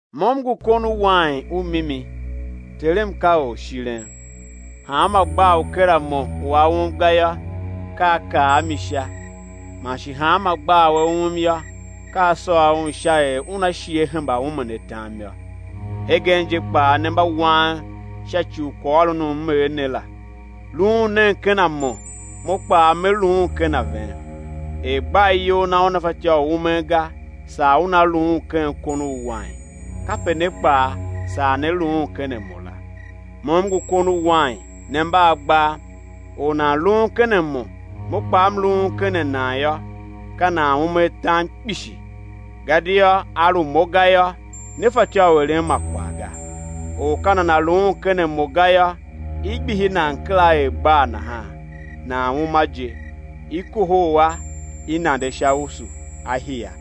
Mo M ngu kon u wain u mimi, Terem ka orshiren. Hanma gbaa u ker a Mo u a um ga yô, ka A kar a mi sha; man shi hanma gbaa u a um yô, ka A sôr un sha er una shi á hemba umen atam yô. Hegen je kpaa ne mba wang sha ci u kwaghôron u M er ne la. Luun nen ken a Mo, Mo kpaa Me luun ken a ven. Er gbaa iyol na una fatyô u umen ga, saa una luun ken kon u wain, kape ne kpaa, saa né luun ken a Mo la. Mo M ngu kon u wain, ne mba agbaa; or u nan luun ken a Mo Mo kpaa M luun ken a nan yô, ka nan ume atam kpishi; gadia a lu Mo ga yô, ne fatyô u eren ma kwagh ga. Or ka nana luun ken a Mo ga yô, i gbihi nan kera er gbaa nahan, nan uma je; i kohol a, i nande sha usu, a hia.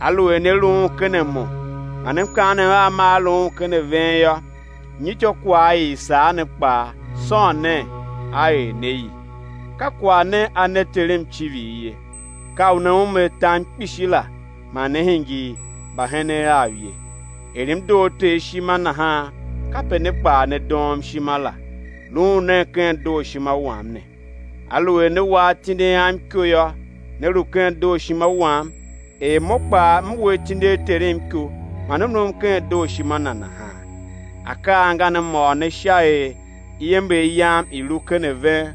Aluer ne luun ken a Mo, man mkaanem Am maa luun ken a ven yô, nyi ityôkwagh i i sar ne kpaa, sôn, nen, á er ne i. Ka kwagh ne a ne Terem icivir ye, ka u ne ume atam kpishi la, man ne hingir mbahenen Av ye. Er M doo Ter ishima, nahan kape ne kpaa, ne doom ishima la; luun nen ken dooshima wam ne. Aluer ne wa atindi Am iko yô, né lu ken dooshima Wam; er Mo kpaa M we atindi a Terem iko, man M luun ken dooshima Na nahan. Akaa angan M ôr ne sha er iember Yam i̱ lu ken ven,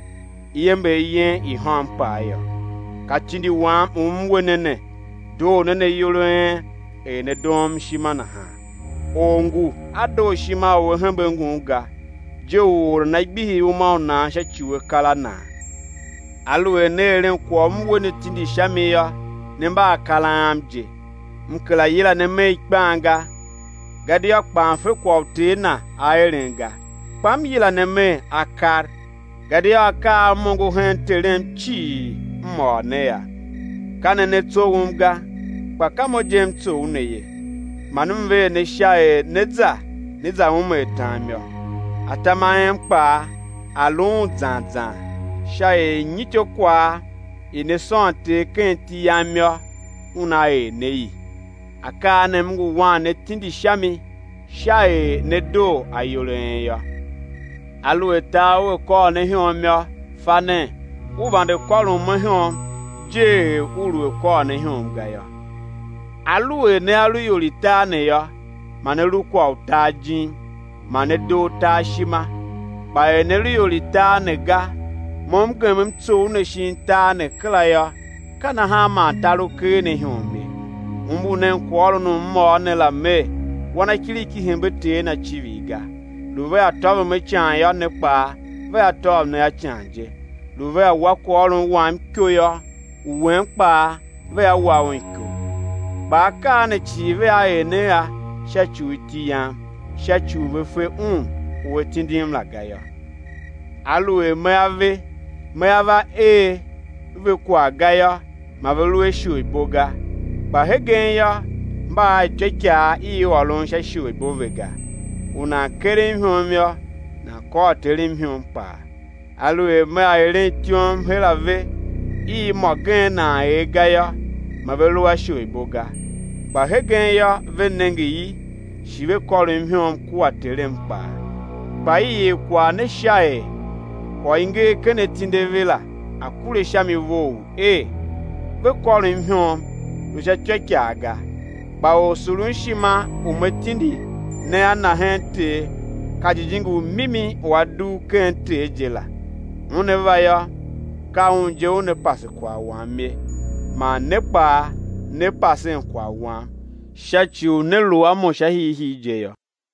iember yen i̱ hôm kpaa yô. Ka tindi Wam u M we ne ne, doo nen ayol a en, er ne doom ishima nahan. Or ngu a dooshima u a hembe ngun ga, je u or nana gbihi uma u nan sha ci u akar a nan. Aluer ne eren kwagh u M we ne tindi sha mi yô, ne mba akar Am je. M kera yila ne Mer ikpan ga, gadia kpan fe kwagh u ter na a eren ga; kpa M yila ne Mer, akar, gadia akaa a M ongo hen Terem cii, M ôr ne a. Ka ne ne tsoughom ga, kpa ka Mo je M tsough ne ye; man M ver ne sha er né za, né za ume atam yô, atam a en kpaa a̱ luun zan zan, sha er nyi ityôkwagh i ne sôn Ter ken iti Yam yô, Una er ne i. Akaa ne M ngu wan ne tindi sha mi, sha er ne̱ doo ayol a en yô. Aluer tar ua kôr ne ihom yô, fa nen u vande kôron Mo ihom je er u lu a kôr ne ihom ga yô. Aluer nea lu ior i tar ne yô, ma ne lu kwagh u tar jim, ma ne doo tar ishima; kpa er ne lu ior i tar ne ga, Mo M gem M tsough ne shin tar ne kera yô, ka nahan man tar u ker ne ihom ye. Umbur nen kwaghôron u M ôr ne la Mer: Wanakiriki hembe Ter na icivir ga; lu vea tôvom a ican yô, ne kpaa vea tôv ne a ican je; lu vea wa kwaghôron Wam iko yô, u wen kpaa vea wa un iko. Kpa akaa ne cii vea er ne a sha ci u iti Yam sha ci u ve fe Un u A tindim la ga yô. Aluer Mea ve, Mea va er ve kwagh ga yô, ma ve lu a isholibo ga; kpa hegen yô, mba a ityôikaa i ôron sha isholibo ve ga. U nan kerem ihom yô, nan kôr Terem ihom kpaa. Aluer Mea eren ityom her a ve i mô gen nan er ga yô, ma ve lu a isholibo ga; kpa hegen yô, ve nenge i, shi ve kôrom ihom kua Terem kpaa. Kpa i er kwagh ne sha er kwagh u i nger ken atindi a ve la, a̱ kure sha mi vough er: Ve kôrom ihom lu sha ityôikaa ga. Kpa Orsurunshima u Me tindi ne a Na hen Ter, ka Jijingi u mimi u A dugh ken Ter je la, Una va yô, ka Un je Una pase kwagh Wam ye. Man ne kpaa, né pasen kwagh Wam sha ci u ne lu a Mo sha hiihii je yô.